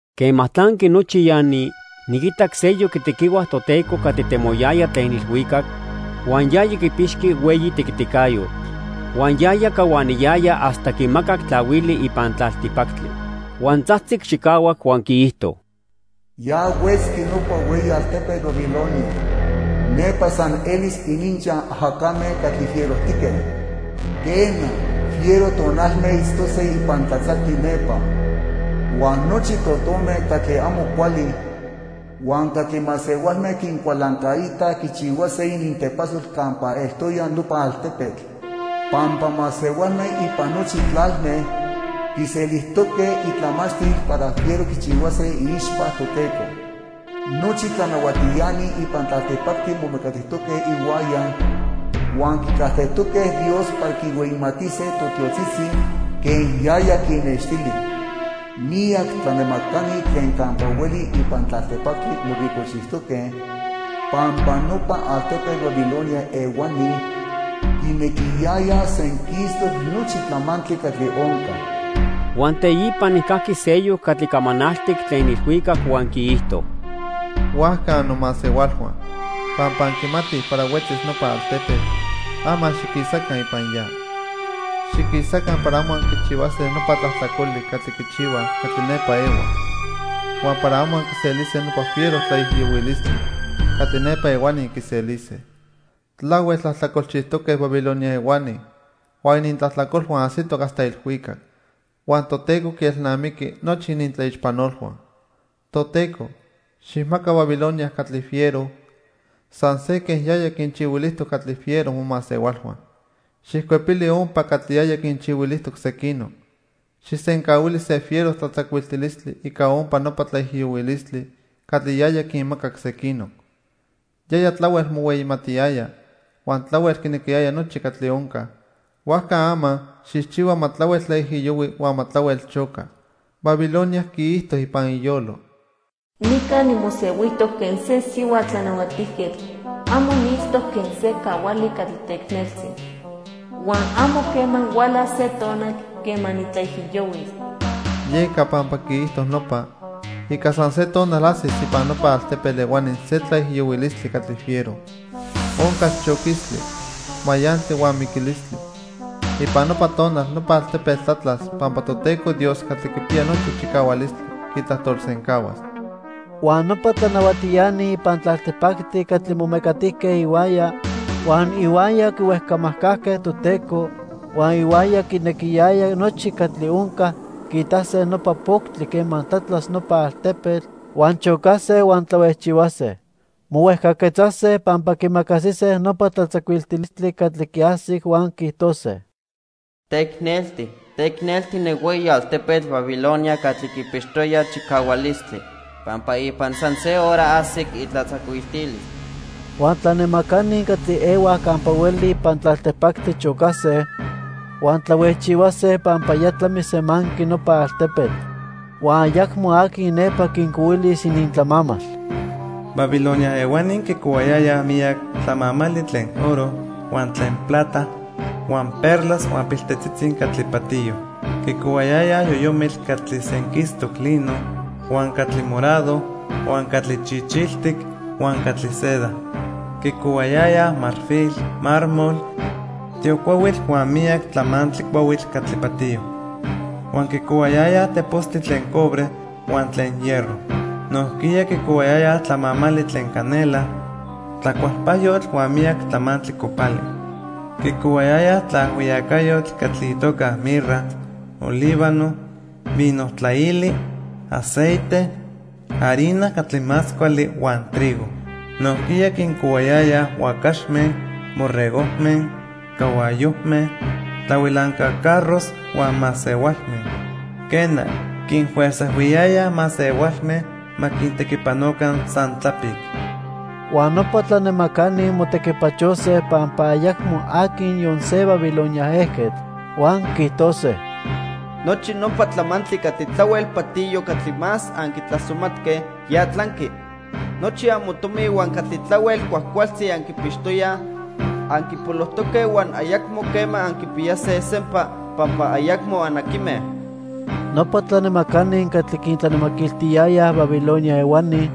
Quema tlanqui nochi ya ni, niquitac seyoc itequihua Toteco catli temoyaya tlen ilhuicac, huan yaya quipixqui hueyi tequiticayotl. Huan yaya cahuaniyaya hasta quimacac tlahuili ipan tlaltipactli. Huan tzajtzic chicahuac huan quiijto: "Ya huetzqui nopa hueyi altepetl Babilonia. Nepa san elis ininchaj ajacame catli fierojtique. Quena, fiero tonalme itztose ipan tlatzactli nepa. Huan nochi totome catli amo cuali huan catli masehualme quincualancaitaj quichihuase inintepasol campa eltoya nopa altepetl. Pampa masehualme ipan nochi tlalme quiselijtoque itlamachtil para fiero quichihuase iixpa Toteco. Nochi tlanahuatiani ipan tlaltipactli momecatijtoque ihuaya huan quicajtejtoque Dios para quinhueyimatise totiotzitzi quen yaya quinnextili. Miyac tlanemacani tlen campa hueli ipan tlaltipactli moricojchijtoque pampa nopa altepetl Babilonia ehuani quinequiyayaj senquistoc nochi tlamantli catli onca." Huan teipa nijcajqui seyoc catli camanaltic tlen ilhuicac huan quiijto: "Huajca annomasehualhua, pampa anquimatij para huetzis nopa altepetl, ama xiquisaca ipan ya. Xiquisaca para amo anquichihuase nopa tlajtlacoli catli quichihuaj catli nepa ehuaj, huan para amo anquiselise nopa fiero tlaijiyohuilistli catli nepa ehuani quiselise. Tlahuel tlajtlacolchijtoque Babilonia ehuani huan inintlajtlacolhua ajsitoc hasta ilhuicac. Huan Toteco quielnamiqui nochi inintlaixpanolhua. Toteco, xijmaca Babilonia catli fiero, san se quen yaya quinchihuilijtoc catli fiero momasehualhua. Xijcuepili ompa catli yaya quinchihuilijtoc sequinoc. Xijsencahuili se fiero tlatzacuiltilistli ica ompa nopa tlaijiyohuilistli catli yaya quinmacac sequinoc. Yaya tlahuel mohueyimatiyaya huan tlahuel quinequiyaya nochi catli onca, huajca ama xijchihua ma tlahuel tlaijiyohui huan ma tlahuel choca. Babilonia quiijto ipan iyolo: 'Nica nimosehuijtoc quen se sihua tlanahuatijquetl. Amo niitztoc quen se cahuali catli teicneltzi. Huan amo quema hualas se tonal quema nitlaijiyohuis.' Yeca, pampa quiijto nopa, ica san se tonal ajsis ipan nopa altepetl ehuani se tlaijiyohuilistli catli fiero. Oncas choquistli, mayantli huan miquilistli. Ipan nopa tonal nopa altepetl tlatlas pampa Toteco Dios Catli Quipiya Nochi Chicahualistli quitlajtolsencahuas." Huan nopa tlanahuatiani ipan tlaltipactli catli momecatijque ihuaya, huan ihuaya quihuejcamajcajque Toteco, huan ihuaya quinequiyayaj nochi catli onca, quiitase nopa poctli quema tlatlas nopa altepetl, huan chocase, huan tlahuejchihuase. Mohuejcaquetzase pampa quiimacasise nopa tlatzacuiltilistli catli quiajsic, huan quiijtose: "¡Teicnelti, teicnelti ne hueyi altepetl Babilonia catli quipixtoya chicahualistli! ¡Pampa ipan san se hora ajsic itlatzacuiltilis!" Huan tlanemacani catli ehuaj campa hueli ipan tlaltipactli chocase huan tlahuejchihuase pampa ya tlamisemanqui nopa altepetl huan ayacmo aqui nepa quincohuilis inintlamamal. Babilonia ehuani quicohuayayaj miyac tlamamali tlen oro, huan tlen plata, huan perlas huan piltetzitzi catli patiyo. Quicohuayayaj yoyomitl catli senquistoc lino, huan catli morado, huan catli chichiltic huan catli seda. Quicohuayayaj marfil, mármol, tiocuahuitl huan miyac tlamantli cuahuitl catli patiyo. Huan quicohuayayaj tepostli tlen cobre huan tlen hierro. Nojquiya quicohuayayaj tlamamali tlen canela, tlacualpajyotl huan miyac tlamantli copali. Quicohuayayaj tlaajhuiyacayotl catli itoca mirra, olíbano, vino tlaili, aceite, harina catli más cuali, huan trigo. Nojquiya quincohuayayaj huacaxme, borregojme, cahuayojme, tlahuilanca carros huan masehualme. Quena, quinfuerzajhuiyayaj masehualme ma quintequipanoca san tlapic. Huan nopa tlanemacani motequipachose pampa ayacmo aqui niyon se Babilonia ejquetl. Huan quiijtose: "Nochi nopa tlamantli catli tlahuel patiyo catli más anquitlasomatque, ya tlanqui. Nochi amotomi huan catli tlahuel cuajcualtzi anquipixtoyaj, anquipolojtoque huan ayacmo quema anquipiyase sempa pampa ayacmo anaquime." Nopa tlanemacani catli quintlanemaquiltiyayaj Babilonia ehuani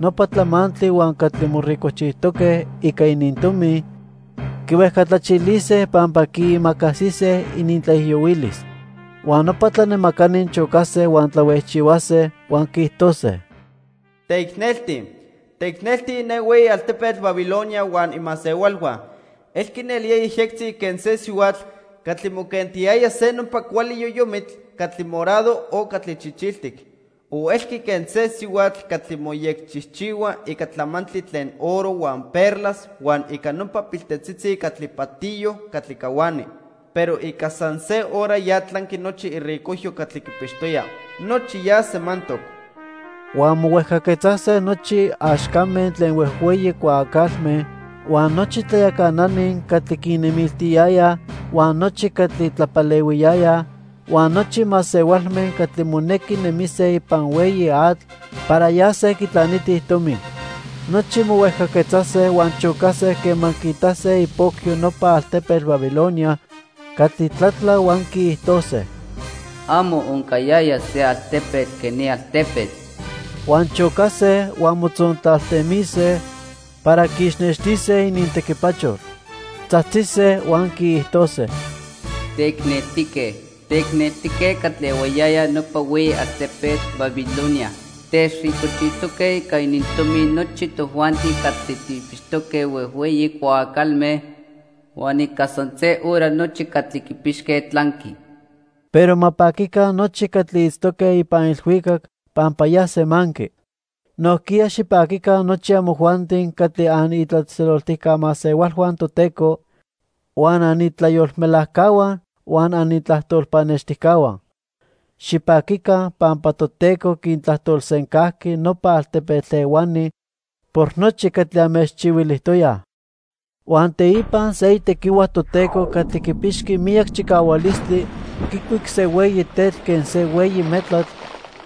nopa tlamantli huan catli moricojchijtoque ica inintomi, quihuejcatlachilise pampa quiimacasise inintlaijiyohuilis. Huan nopa tlanemacani chocase huan tlahuejchihuase, huan quiijtose: "¡Teicnelti, teicnelti ne hueyi altepetl Babilonia huan imasehualhua! Elqui nelía yejyectzi quen se sihuatl catli moquentiyaya se nopa cuali yoyomitl catli morado o catli chichiltic. O elqui quen se sihuatl catli moyecchijchihua ica tlamantli tlen oro, huan perlas, huan ica nopa piltetzitzi catli patiyo catli cahuani. Pero ica san se hora ya tlanqui nochi iricojyo catli quipixtoya. ¡Nochi ya semantoc!" Huan mohuejcaquetzase nochi axcame tlen huejhueyi cuaacalme, huan nochi tlayacanani catli quinnemiltiyayaj, huan nochi catli tlapalehuiyayaj, huan nochi masehualme catli monequi nemise ipan hueyi atl para yase quitlanitij tomi. Nochi mohuejcaquetzase huan chocase quema quiitase ipocyo nopa altepetl Babilonia catli tlatla huan quiijtose: "Amo oncayaya se altepetl quen ni altepetl." Huan chocase huan motzontlaltemise para quiixnextise inintequipachol. Tzajtzise huan quiijtose: "¡Teicneltique, teicneltique catli ehuayaya nopa hueyi altepetl Babilonia! Techricojchijtoque ica inintomi nochi tojuanti catli tijpixtoque huejhueyi cuaacalme, huan ica san se hora nochi catli quipixque tlanqui." Pero ma paquica nochi catli itztoque ipan ilhuicac pampa ya semanqui. Nojquiya xipaquica nochi amojuanti catli anitlatzejtzeloltijca masehualhua Toteco, huan anitlayolmelajcahua huan anitlajtol pannextijcahua. Xipaquica pampa Toteco quintlajtolsencajqui nopa altepetl ehuani por nochi catli anmechchihuilijtoyaj. Huan teipa se itequihua Toteco catli quipixqui miyac chicahualistli quicuic se hueyi tetl quen se hueyi metlatl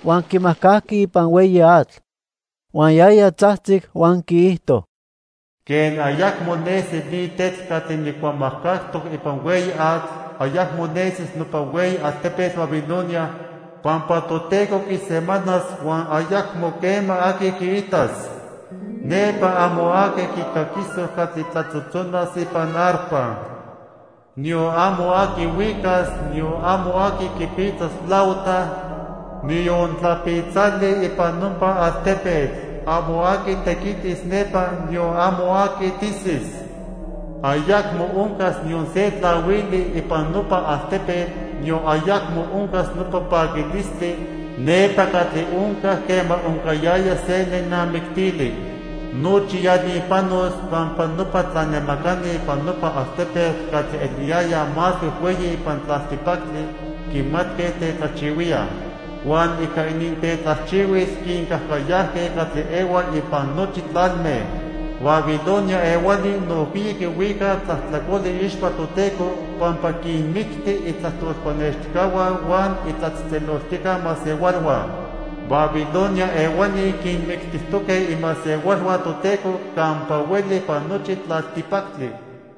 huan quimajcajqui ipan hueyi atl. Huan yaya tzajtzic huan quiijto: "Quen ayacmo nesi ni tetl catli nijcuamajcajtoc ipan hueyi atl, ayacmo nesis nopa hueyi altepetl Babilonia pampa Toteco quisemanas huan ayacmo quema aqui quiitas. Nepa amo aqui quicaquisoc catli tlatzotzonas ipan arpa. Niyon amo aqui huicas, niyon amo aqui quipitzas flauta, niyon tlapitzali ipan nopa altepetl. Amo aqui tequitis nepa, niyon amo aqui tisis. Ayacmo oncas niyon se tlahuili ipan nopa altepetl, niyon ayacmo oncas nopa paquilistli nepa catli oncac quema oncayaya se nenamictili. Nochi ya ni panos pampa nopa tlanemacani ipan nopa altepetl catli eliyayaj más huejhueyi ipan tlaltipactli quimatque tetlajchihuíaj. Huan ica inintetlajchihuil quincajcayajque catli ehuaj ipan nochi tlalme." Babilonia ehuani nojquiya quihuicaj tlajtlacoli iixpa Toteco pampa quinmicti itlajtol pannextijcahua huan itlatzejtzeloltijca masehualhua. Babilonia ehuani quinmictijtoque imasehualhua Toteco campa hueli ipan nochi tlaltipactli.